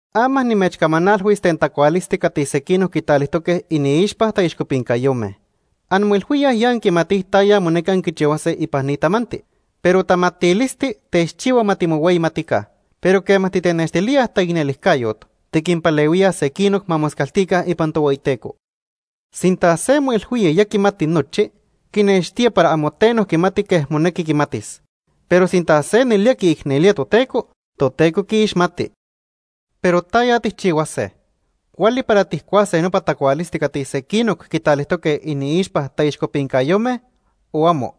Ama nimechcamanalhuis ten tacualisti cati sequinoc quitalijtoque iniixpa taixcopincayome. Anmoilhuíaj ya anquimatij taya monequi anquichihuase ipan ni tamanti, pero tamatilisti techchihua ma timohueyimatica. Pero quema titenextilíaj taicnelijcayot, tiquinpalehuíaj sequinoc ma moscaltica ipan Tohueyiteco. Sinta se moilhuía ya quimati nochi, quinextía para amo teno quimati quej monequi quimatis. Pero sinta se nelía quiicnelía Toteco, Toteco quiixmati. Pero ¿taya tijchihuase? ¿Cuali para tijcuase nopa tacualisti cati sequinoc quitalijtoque iniixpa taixcopincayome, o amo?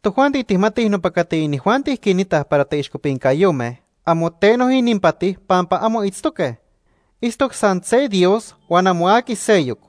Tojuanti tijmatij nopa cati inijuanti quinitaj para taixcopincayome, amo teno ininpati, pampa amo itztoque. Itztoc san se Dios huan amo aqui seyoc.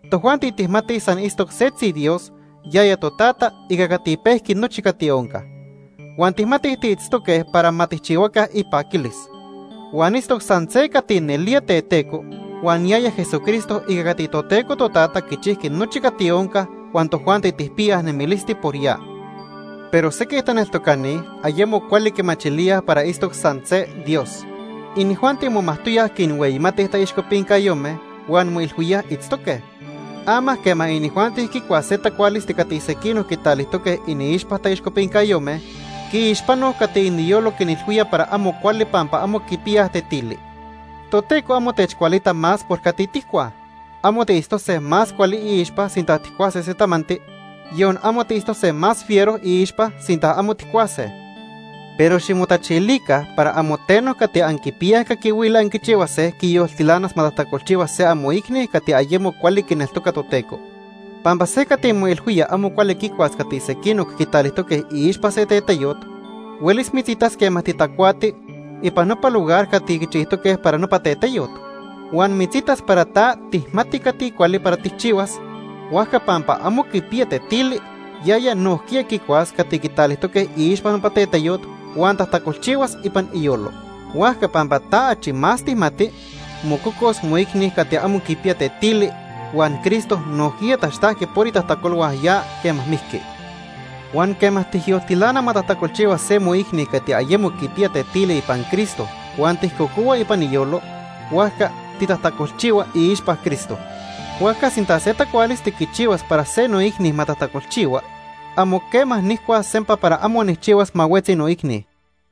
tojuanti tijmatij san itztoc setzi Dios, yaya Totata, ica cati pejqui nochi cati onca. Huan tijmatij tiitztoque para ma tijchihuaca ipaquilis. Huan itztoc san se cati nelía teteco huan yaya Jesucristo ica cati Toteco Totata quichijqui nochi cati onca huan tojuanti tijpiyaj nemilisti por ya. Pero sequij taneltocani ayemo cuali quimachilíaj para itztoc san se Dios. Inijuanti momajtoyaj quinhueyimatij taixcopincayome huan moilhuíaj itztoque. Ama quema inijuanti quicuaj se tacualisti cati sequinoc quitalijtoque iniixpa taixcopincayome, quiixpanoj cati iniyolo quinilhuía para amo cuali pampa amo quipiyaj tetili. Toteco amo techcualita más por cati tijcuaj. Amo tiitztose más cuali iixpa sinta tijcuase se tamanti, yon amo tiitztose más fiero iixpa sinta amo tijcuase. Pero ximotachilica para amo teno cati anquipiyaj caquihuili anquichihuase, quiyoltilanas ma tajtacolchihua se amoicni cati ayemo cuali quineltoca Toteco. Pampa se cati moilhuía amo cuali quicuas cati sequinoc quitalijtoque iixpa se teteyot huelis mitzitas quema titacuati ipan nopa lugar cati quichijtoque para nopa teteyot. Huan mitzitas para ta tijmati cati cuali para tijchihuas, huajca pampa amo quipiya tetili, yaya nojquiya quicuas cati quitalijtoque iixpa nopa teteyot, huan tajtacolchihuas ipan iyolo. Huajca pampa ta achi más tijmati, mococos moicni cati amo quipiya tetili huan Cristo nojquiya taxtajqui por itajtacolhua ya quema mijqui. Huan quema tijyoltilana ma tajtacolchihua se moicni cati ayemo quipiya tetili ipan Cristo huan tijcocohua ipan iyolo, huajca titajtacolchihua iixpa Cristo. Huajca sinta se tacualisti quichihuas para se noicni ma tajtacolchihua, amo quema nijcuas sempa para amo nijchihuas ma huetzi noicni.